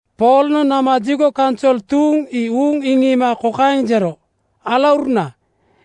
Poolnoŋ nama jigo kaunsol tuuŋ ii uuŋ iŋiima kokaeŋ jero, “Alauruna,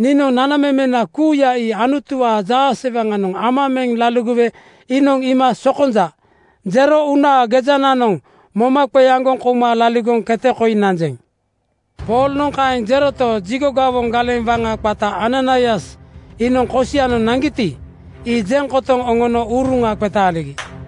niinoŋ nanamemena kuuya ii Anutuwaa jaasewaŋanoŋ ama meŋ laligowe iinoŋ iima ‘Sokonja,’ jero uunaa gejananoŋ moma qeaŋgoŋ kouma laligoŋ kete koi nanjeŋ.” Poolnoŋ kaeŋ jeroto, jigo gawoŋ galeŋ waŋa qata Ananaias iinoŋ kosianoŋ naŋgiti, ii jeŋ kotoŋ oŋono uruŋa qetaaligi.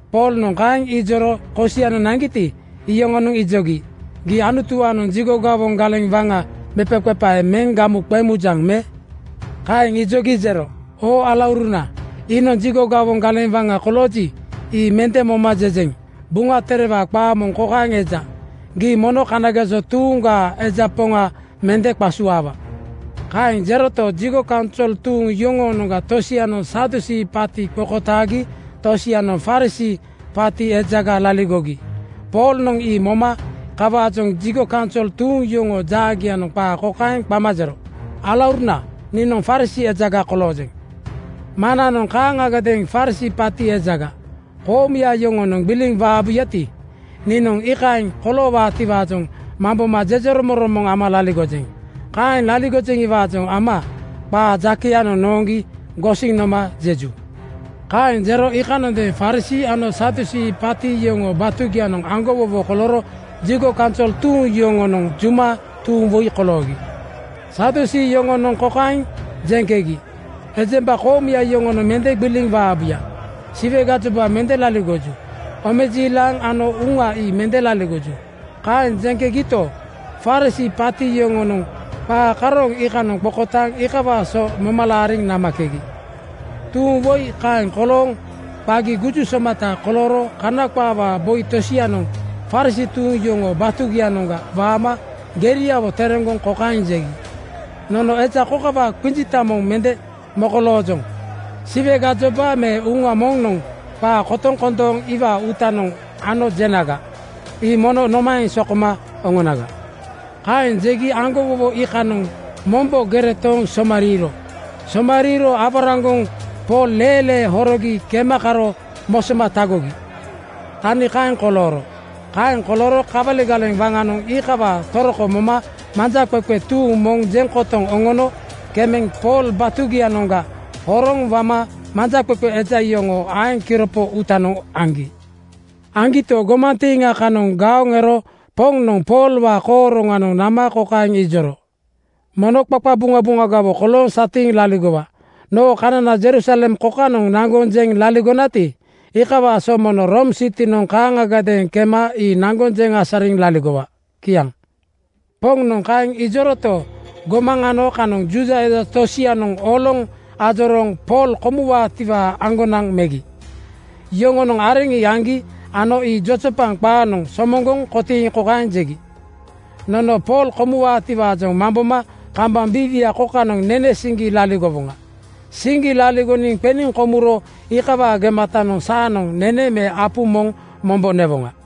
Poolnoŋ kaeŋ ijoro kosianoŋ naŋgiti, iyoŋonoŋ ijogi, “Gii Anutuwaanoŋ jigo gawoŋ galeŋ waŋa mepaqepae meŋ gamu qeŋ mujaŋ me?” Kaeŋ ijogi jero, “Oo alauruna, iinoŋ jigo gawoŋ galeŋ waŋa kolooji, ii mende moma jejeŋ. Buŋa Terewaa qaa moŋ kokaeŋ eja, ‘Gii mono kanageso tuuŋgaa eja poŋa mende qasuaawa.’” Kaeŋ jeroto, jigo kaunsol tuuŋ yoŋoonoŋga tosianoŋ Sadusii (Jigo gawombaa kaparaŋkoŋkoŋ) paati qokotaagi tosianoŋ Farisii (Kana qaawaa kaparaŋkoŋkoŋ) paati ejaga laligogi. Poolnoŋ ii moma kawaajoŋ jigo kaunsol tuuŋ yoŋoo jaagianoŋ qaa kokaeŋ qama jero, “Alauruna, niinoŋ Farisii ejaga koloojeŋ. Maŋnanoŋ kaaŋagadeeŋ Farisii paati ejaga. Koomuya yoŋonoŋ gbiliŋ waabuyati, niinoŋ iikaeŋ koloowaatiwaajoŋ mamboma jejeromoŋromoŋ ama laligojeŋ. Kaeŋ laligojeŋiwaajoŋ ama qaa jakeyanoŋ nooŋgi gosiŋ noma jeju.” Kaeŋ jero iikanondeeŋ Farisii ano Sadusii paati yoŋoo batugianoŋ aŋgowowo kolooro jigo kaunsol tuuŋ yoŋonoŋ juma tuuŋ woi koloogi. Sadusii (Jigo gawombaa kaparaŋkoŋkoŋ) yoŋonoŋ kokaeŋ jeŋkegi, “Ejemba koomuya yoŋonoŋ mende gbiliŋ waabuya. Siwe gajoba mende laligoju. Omejiilaŋ ano uŋa ii mende laligoju.” Kaeŋ jegito, Farisii (Kana qaawaa kaparaŋkoŋkoŋ) paati yoŋonoŋ qaa karooŋ iikanoŋ qokotaaŋ iikawaa so moma laariŋ namakegi. Tuuŋ woi kaeŋ kolooŋ qagi guju somata kolooro Kana qaawaa boi tosianoŋ Farisii tuuŋ yoŋoo batugianoŋga waama geriawo tereŋgoŋ kokaeŋ jegi, “Nono eja kokawaa qinjita moŋ mende mokoloojoŋ. Siwe gajoba me uŋa moŋnoŋ qaa kotoŋ kondooŋ iwaa uutanoŋ ano jenaga, ii mono nomaeŋ sokoma oŋonaga?” Kaeŋ jegi aŋgowowo iikanoŋ mombo gere tooŋ somariiro. Somariiro aworaŋgoŋ Pool leelee horogi kema karo mosoma tagogi. Tani kaeŋ kolooro. Kaeŋ kolooro kawali galeŋ waŋanoŋ iikawaa toroko moma manjaqeqe tuuŋ moŋ jeŋ kotoŋ oŋono kemeŋ Pool batugianoŋga horoŋ wama manjaqeqe eja yoŋoo aeŋ kiropo uutanoŋ aŋgi. Aŋgito, gomantiiŋa kanoŋ gaoŋ ero Poŋnoŋ Poolwaa kooroŋanoŋ nama kokaeŋ ijoro, “Mono qaqabuŋabuŋagawo kolooŋ satiiŋ laligowa. Noo kanana Jerusalem kokanoŋ naŋgoŋ jeŋ laligonati, iikawaa so mono Room sitinoŋ kaaŋagadeeŋ kema ii naŋgoŋ jeŋ asariŋ laligowa.” Kiaŋ. Poŋnoŋ kaeŋ ijoroto, gomaŋ ano kanoŋ Juuda eja tosianoŋ oloŋ ajorooŋ Pool komuwaatiwaa aŋgonaŋ megi. Yoŋonoŋ areŋ ii aŋgi ano ii jojopaŋ qaanoŋ somoŋgoŋ kotiiŋ kokaeŋ jegi, “Nono Pool komuwaatiwaajoŋ mamboma kambaŋ biiwia kokanoŋ nene siŋgi laligowoŋa. Siŋgi laligoŋ qeniŋ komuro iikawaa gematanoŋ saanoŋ nene me apu moŋ mombo newoŋa.”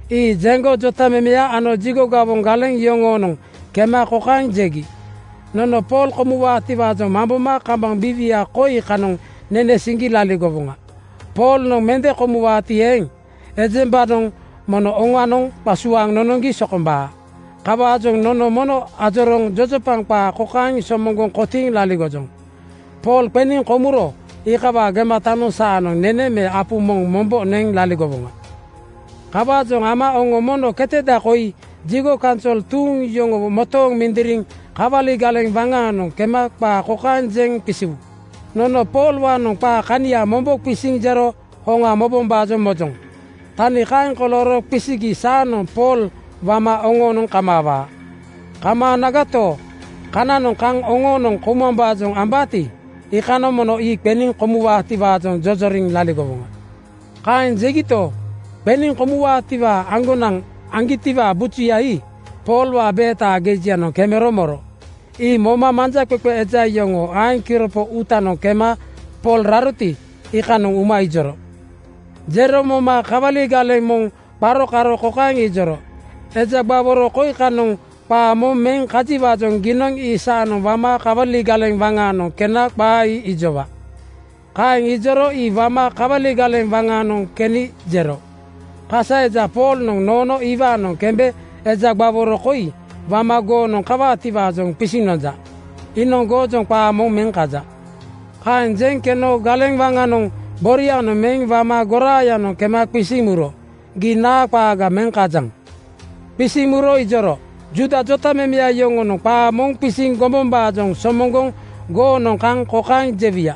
Ii jeŋgo jotamemeya ano jigo gawoŋ galeŋ yoŋoonoŋ kema kokaeŋ jegi, “Nono Pool komuwaatiwaajoŋ mamboma kambaŋ biiwia koi kanoŋ nene siŋgi laligowoŋa. Poolnoŋ mende komuwaati eeŋ, ejembanoŋ mono oŋanoŋ qasuaaŋ nonoŋgi sokombaa. Kawaajoŋ nono mono ajorooŋ jojopaŋ qaa kokaeŋ somoŋgoŋ kotiiŋ laligojoŋ: Pool qeniŋ komuro iikawaa gematanoŋ saanoŋ nene me apu moŋ mombo neŋ laligowoŋa. Kawaajoŋ ama oŋo mono keteda koi jigo kaunsol tuuŋ yoŋowo motooŋ mindiriŋ kawali galeŋ waŋaanoŋ kema qaa kokaeŋ jeŋ qisiwu, ‘Nono Poolwaanoŋ qaa kania mombo qisiniŋ jero hoŋa mobombaajoŋ mojoŋ.’ Tani kaeŋ kolooro qisigi saanoŋ Pool wama oŋoonoŋ kamaawaa. Kamaanagato, kananoŋ kaŋ oŋoonoŋ koumambaajoŋ ambaati, iikanoŋ mono ii qeniŋ komuwaatiwaajoŋ jojoriŋ laligowoŋa.” Kaeŋ jegito, qeniŋ komuwaatiwaa aŋgonaŋ aŋgitiwaa bujuya ii Poolwaa beetaa gejianoŋ kemero moro. Ii moma manjaqeqe eja yoŋoo aeŋ kiropo uutanoŋ kema Pool raroti, iikanoŋ uma ijoro. Jero moma kawali galeŋ moŋ qaro karo kokaeŋ ijoro, “Eja gbaworo koi kanoŋ qaa moŋ meŋ kajiwaajoŋ giinoŋ ii saanoŋ wama kawali galeŋ waŋaanoŋ kena qaa ii ijowaa.” Kaeŋ ijoro ii wama kawali galeŋ waŋaanoŋ keni jero, “Kasa eja Poolnoŋ noono iwaanoŋ kembe eja gbaworo koi wama goonoŋ kawaatiwaajoŋ qisiŋ nonja. Iinoŋ goojoŋ qaa moŋ meŋ kaja.” Kaeŋ jeŋ keno galeŋ waŋanoŋ borianoŋ meŋ wama goraayanoŋ kema qisiŋ muro, “Gii naa qaaga meŋ kajaŋ?” Qisiŋ muro ijoro, “Juuda jotamemeya yoŋonoŋ qaa moŋ qisiŋ gombombaajoŋ somoŋgoŋ goonoŋ kaŋ kokaeŋ jewuya: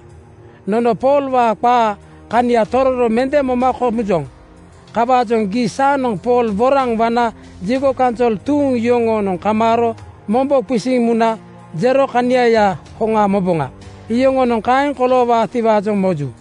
Nono Poolwaa qaa kania tororo mende moma komujoŋ. Kawaajoŋ gii saanoŋ Pool woraŋ wana jigo kaunsol tuuŋ yoŋoonoŋ kamaaro mombo qisiŋ muna jero kaniayaa hoŋa moboŋa. Yoŋonoŋ kaeŋ koloowaatiwaajoŋ moju.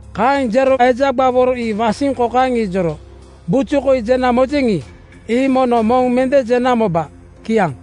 Kaeŋ jero eja gbaworo ii wasiŋ kokaeŋ ijoro, “Buju koi jena mojeŋi, ii mono moŋ mende jena moba.” Kiaŋ.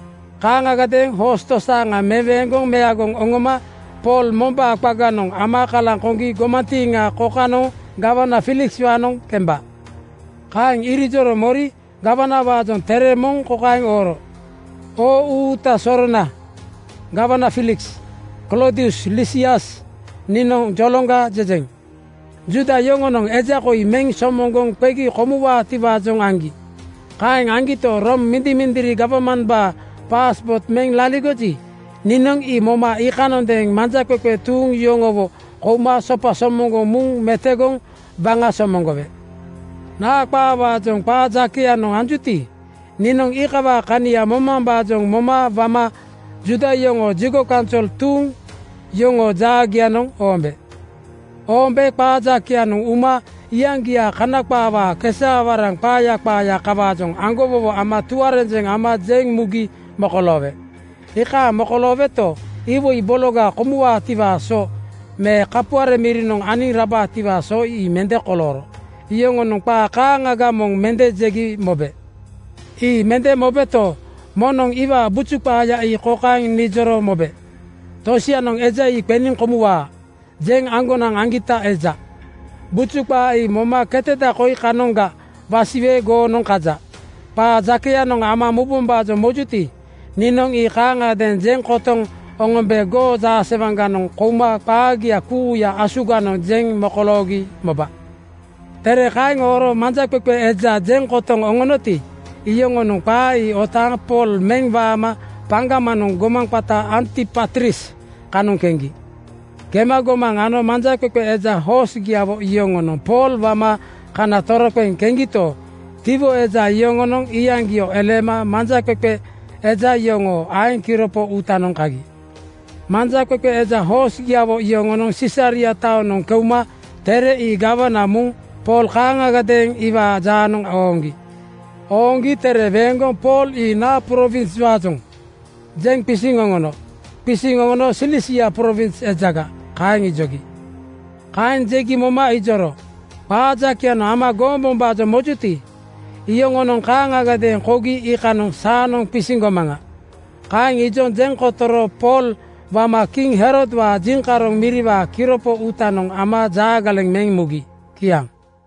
Kaaŋagadeeŋ hoos tosaaŋa meweeŋgoŋ meagoŋ oŋoma Pool mombaa qaganoŋ ama kalaŋ koŋgi gomantiiŋa kokanoŋ gawana Fiilikswaanoŋ kemba.” Kaeŋ irijoro mori gawanawaajoŋ tere moŋ kokaeŋ ooro, “Oo Uuta sorona gawana Fiiliks! Kloodius Lisias, niinoŋ joloŋga jejeŋ. “Juuda yoŋonoŋ eja koi meŋ somoŋgoŋ qegi komuwaatiwaajoŋ aŋgi. Kaeŋ aŋgito, Room mindimindiri gawmambaa (jeŋkooto) paaspoot meŋ laligoji, niinoŋ ii moma iikanondeeŋ manjaqeqe tuuŋ yoŋowo kouma sopa somoŋgoŋ muŋ metogoŋ waŋa somoŋgowe. Naa qaawaajoŋ qaa jakeyanoŋ anjuti, niinoŋ iikawaa kania momambaajoŋ moma wama Juuda yoŋoo jigo kaunsol tuuŋ yoŋoo jaagianoŋ oombe. Oombe qaa jakeyanoŋ uma iyaŋgiaa Kana qaawaa kesaawaraŋ qaaya qaaya kawaajoŋ aŋgowowo ano tuarenjeŋ ama jeŋ mugi mokoloowe. Iikaaŋ mokolooweto, iwoi bologa komuwaatiwaa so me kapuare mirinoŋ aniŋ rabaatiwaa so ii mende kolooro. Yoŋonoŋ qaa kaaŋaga moŋ mende jegi mobe. Ii mende mobeto, moŋnoŋ iwaa buju qaaya ii kokaeŋ nijoro mobe: Tosianoŋ ‘Eja ii qeniŋ komuwaa,’ jeŋ aŋgonaŋ aŋgita eja. Buju qaa ii moma keteda koi kanoŋga wasiwe goonoŋ kaja. Qaa jakeyanoŋ ama mubombaajoŋ mojuti, niinoŋ ii kaaŋagadeeŋ jeŋ kotoŋ oŋombe goo jaasewaŋganoŋ kouma qaagia kuuya asuganoŋ jeŋ mokoloogi moba.” Tere kaeŋ ooro manjaqeqe eja jeŋ kotoŋ oŋoŋgiti, iyoŋonoŋ qaa ii otaaŋ Pool meŋ wama paŋgamanoŋ gomaŋ qata Antipatris kanoŋ keŋgi. Kema gomaŋ ano manjaqeqe eja hoosgiawo yoŋonoŋ Pool wama kana toroqeŋ keŋgito, tiwo eja yoŋonoŋ iyaŋgio eleema manjaqeqe eja yoŋoo aeŋ kiropo uutanoŋ kagi. Manjaqeqe eja hoosgiawo yoŋonoŋ Sisaria taonoŋ keuma tere ii gawana muŋ Pool kaaŋagadeeŋ iwaa jaanoŋ ooŋgi. Ooŋgi tere weeŋgoŋ “Pool ii naa prowinswaajoŋ?” jeŋ qisiŋ oŋono. Qisiŋ oŋono “Silisia prowins ejaga,” kaeŋ ijogi. Kaeŋ jegi moma ijoro, “Qaa jakeyanoŋ ama gombombaajoŋ mojuti, iyoŋonoŋ kaaŋagadeeŋ kougi iikanoŋ saanoŋ qisiŋ gomaŋa.” Kaeŋ ijoŋ jeŋ kotoro Pool wama kiŋ Herodwaa jiŋkaroŋ miriwaa kiropo uutanoŋ ama jaagaleŋ meŋ mugi. Kiaŋ.